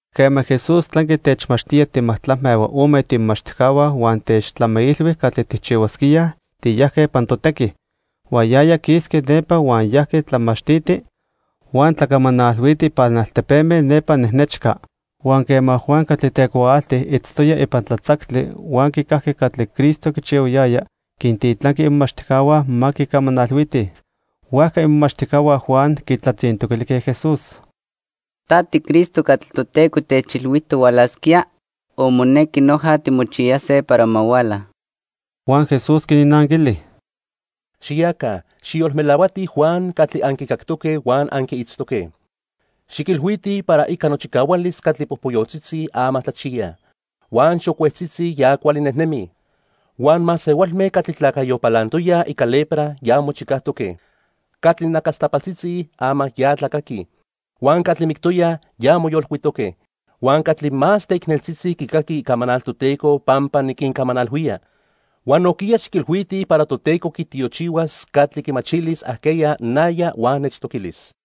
Quema Jesús tlanqui techmachtía timajtlacme huan ome tiimomachtijcahua huan techtlamiilhui catli tijchihuasquíaj, tiyajque ipan totequi. Huan yaya quisqui nepa huan yajqui tlamachtiti huan tlacamanalhuiti ipan altepeme nepa nejnechca. Huan quema Juan catli tecuaalti itztoya ipan tlatzactli huan quicajqui catli Cristo quichihuayaya, quintitlanqui imomachtijcahua ma quicamanalhuitij. Huajca imomachtijcahua Juan quitlatzintoquilijque Jesús: —¿Ta tiCristo catli Toteco techilhuijtoc hualasquía o monequi noja timochiyase para ma huala? Huan Jesús quinnanquili: "Xiyaca, xijyolmelahuatij Juan catli anquicactoque huan anquiitztoque. Xiquilhuitij para ica nochicahualis catli popoyotzitzi, ama tlachiyaj. Huan xocuetzitzi, ya cuali nejnemij. Huan masehualme catli tlacayo palantoyaj ica lepra, ya mochicajtoque. Catli nacastapaltzitzi, ama ya tlacaquij. Huan catli mictoyaj, ya moyolcuitoque. Huan catli más teicneltzitzi quicaquij icamanal Toteco pampa niquincamanalhuía. Huan nojquiya xiquilhuitij para Toteco quitiochihuas catli quimachilis ajqueya naya huan nechtoquilis."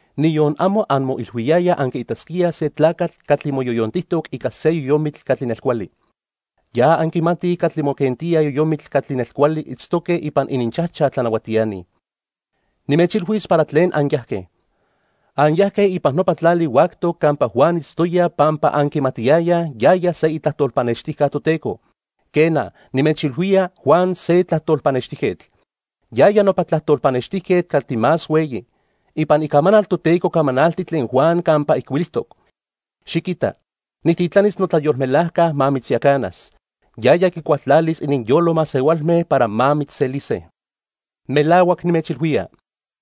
Niyon amo anmoilhuiyayaj anquiitasquíaj se tlacatl catli moyoyontijtoc ica se yoyomitl catli nelcuali. Ya anquimatij catli moquentíaj yoyomitl catli nelcuali itztoque ipan ininchajchaj tlanahuatiani. Nimechilhuis para tlen anyajque. Anyajque ipan nopa tlali huactoc campa Juan itztoya pampa anquimatiyayaj yaya se itlajtol pannextijca Toteco. Quena, nimechilhuía Juan se tlajtol pannextijquetl. Yaya nopa tlajtol pannextijquetl catli más hueyi. Ipan Icamanal Toteco camanalti tlen Juan campa ijcuilijtoc: 'Xiquita, nijtitlanis notlayolmelajca ma mitzyacanas. Yaya quicualtlalis ininyolo masehualme para ma mitzselise.' Melahuac nimechilhuía,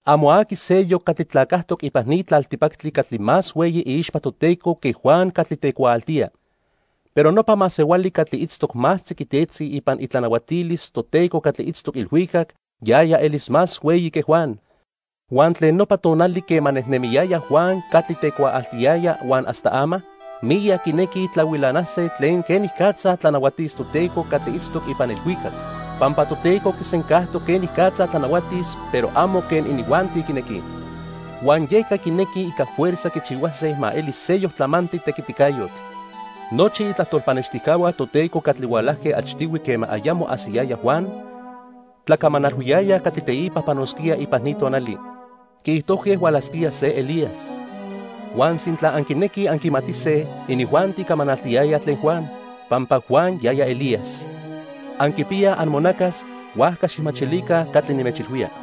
amo aqui seyoc catli tlacajtoc ipan ni tlaltipactli catli más hueyi iixpa Toteco que Juan catli tecuaaltía. Pero nopa masehuali catli itztoc más tziquitetzi ipan itlanahuatilis Toteco catli itztoc ilhuicac, yaya elis más hueyi que Juan. "Huan tlen nopa tonali quema nejnemiyaya Juan catli tecuaaltiyaya huan hasta ama, miyac quinequij tlahuilanase tlen quenicatza tlanahuatis Toteco catli itztoc ipan ilhuicac, pampa Toteco quisencajtoc quenicatza tlanahuatis pero amo quen inijuanti quinequij. Huan yeca quinequij ica fuerza quichihuase ma eli seyoc tlamantli tequiticayotl. Nochi itlajtol pannextijcahua Toteco catli hualajque achtihui quema ayamo ajsiyaya Juan, tlacamanalhuiyayaj catli teipa panosquía ipan ni tonali. Quiijtojque hualasquía se Elías, huan sintla anquinequij anquimatise, inijuanti camanaltiyayaj tlen Juan, pampa Juan yaya Elías. Anquipiyaj amonacas, huajca xijmachilica catli nimechilhuía.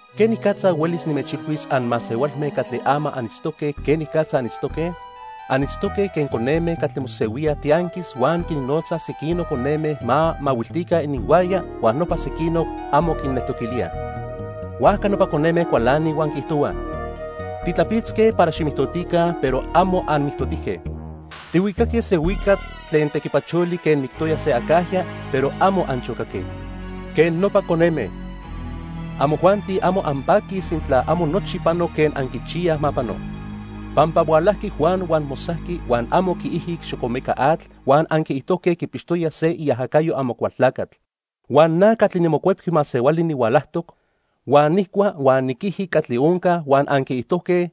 "¿Quenicatza huelis nimechilhuis anmasehualme catli ama anitztoque quenicatza anitztoque? Anitztoque quen coneme catli mosehuíaj tianquis huan quinnotzaj sequinoc coneme ma mahuiltica ininhuaya huan nopa sequinoc amo quinneltoquilíaj. Huajca nopa coneme cualanij huan quiijtohuaj: 'Titlapitzque para ximijtotica, pero amo anmijtotijque. Tihuicaque se huicatl tlen tequipacholi quen mictoya se acajya, pero amo anchocaque.' Quen nopa coneme, amojuanti amo anpaquij sintla amo nochi pano quen anquichiyaj ma pano. Pampa hualajqui Juan huan mosajqui huan amo quiijic xocomeca atl huan anquiijtojque quipixtoya se iajacayo Amocualtlacatl. Huan na catli niMocuepqui Masehuali nihualajtoc, huan nijcua huan niquiji catli onca huan anquiijtojque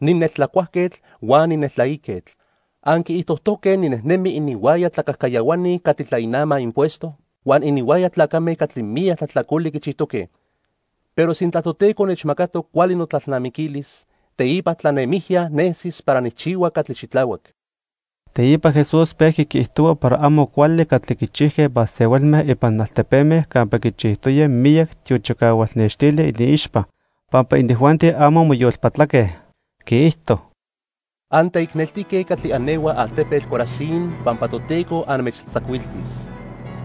nineltlacuajquetl huan nineltlaiquetl. Anquiijtojtoque ninejnemi ininhuaya tlacajcayahuani catli tlainamaj impuesto huan ininhuaya tlacame catli miyac tlajtlacoli quichijtoque. Pero sintla Toteco nechmacatoc cuali notlalnamiquilis, teipa tlanemijya nesis para nijchihua catli xitlahuac." Teipa Jesús pejqui quiijtohua para amo cuali catli quichijque masehualme ipan altepeme campa quichijtoya miyac tiochicahual nextili iniixpa, pampa inijuanti amo moyolpatlaque. Quiijto: "Anteicneltique catli anehuaj altepetl Corazín pampa Toteco anmechtlatzacuiltis.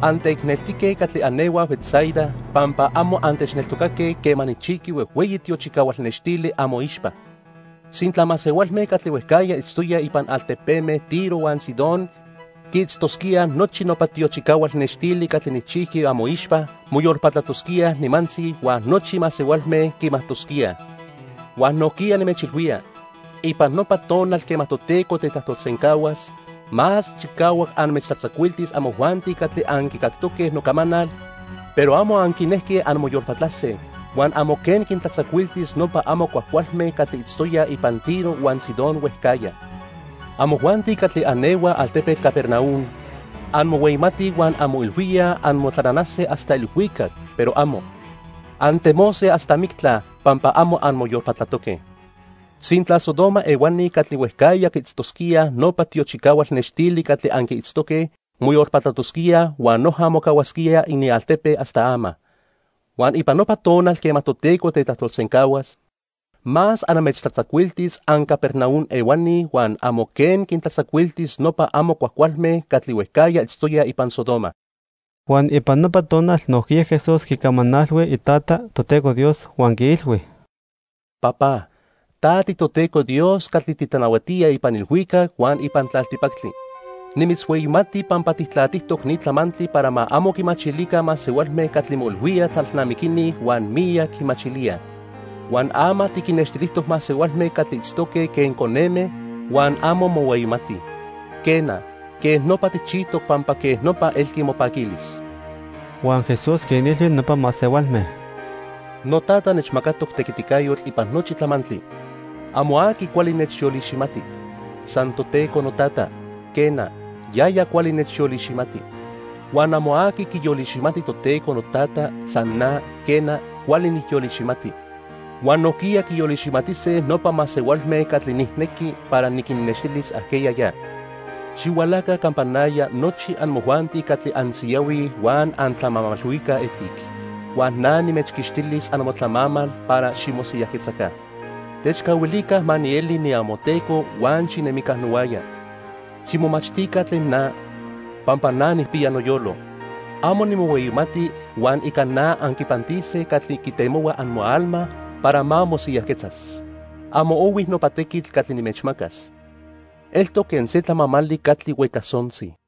Anteicneltique catli anehuaj Betsaida, pampa amo antechneltocaque quema nijchijqui huejhueyi tiochicahual nextili amoixpa. Sintla masehualme catli huejcajya itztoyaj ipan altepeme Tiro huan Sidón quiitztosquíaj nochi nopa tiochicahual nextili catli nijchijqui amoixpa, moyolpatlatosquíaj nimantzi huan nochi masehualme quimajtosquíaj. Huan nojquiya nimechilhuía, ipan nopa tonal quema Toteco tetlajtolsencahuas, más chicahuac anmechtlatzacuiltis amojuanti catli anquicactoque nocamanal, pero amo anquinejque anmoyolpatlase, huan amo quen quintlatzacuiltis nopa amo cuajcualme catli itztoyaj ipan Tiro huan Sidón huejcajya. Amojuanti catli anehuaj altepetl Capernaum, anmohueyimatij huan anmoilhuíaj anmotlananase hasta ilhuicac, pero amo. Antemose hasta mictla pampa amo anmoyolpatlatoque. Sintla Sodoma ehuani catli huejcajya quiitztosquíaj nopa tiochicahual nextili catli anquiitztoque, moyolpatlatosquíaj huan noja mocahuasquía inialtepe hasta ama. Huan ipan nopa tonal quema Toteco tetlajtolsencahuas, más anmechtlatzacuiltis anCapernaum ehuani huan amo quen quintlatzacuiltis nopa amo cuajcualme catli huejcajya itztoyaj ipan Sodoma." Huan ipan nopa tonal nojquiya Jesús quicamanalhui Itata, Toteco Dios, huan quiilhui: "Papá, ta tiToteco Dios catli titlanahuatía ipan ilhuicac huan ipan tlaltipactli. Nimitzhueyimati pampa tijtlatijtoc ni tlamantli para ma amo quimachilica masehualme catli moilhuíaj tlalnamiquini huan miyac quimachilíaj. Huan ama tiquinnextilijtoc masehualme catli itztoque quen coneme huan amo mohueyimatij. Quena, quej nopa tijchijtoc pampa quej nopa elqui mopaquilis." Huan Jesús quinilhui nopa masehualme: "NoTata nechmacatoc tequiticayotl ipan nochi tlamantli. Amo aqui cuali nechyoliximati, san Toteco noTata, quena, yaya cuali nechyoliximati. Huan amo aqui quiyoliximati Toteco noTata, san na, quena, cuali nijyoliximati. Huan nojquiya quiyoliximatise nopa masehualme catli nijnequi para niquinnextilis ajqueya ya. Xihualaca campa naya nochi amojuanti catli ansiyahuij huan antlamamalhuicaj etic, huan na nimechquixtilis amotlamamal para ximosiyajquetzaca. Techcahuilica ma nieli niamoTeco huan xinemica nohuaya. Ximomachtica tlen na, pampa na nijpiya noyolo. Amo nimohueyimati huan ica na anquipantise catli quitemohua amoalma para ma mosiyajquetzas. Amo ohui nopa tequitl catli nimechmacas. Eltoc quen se tlamamali catli huecasontzi."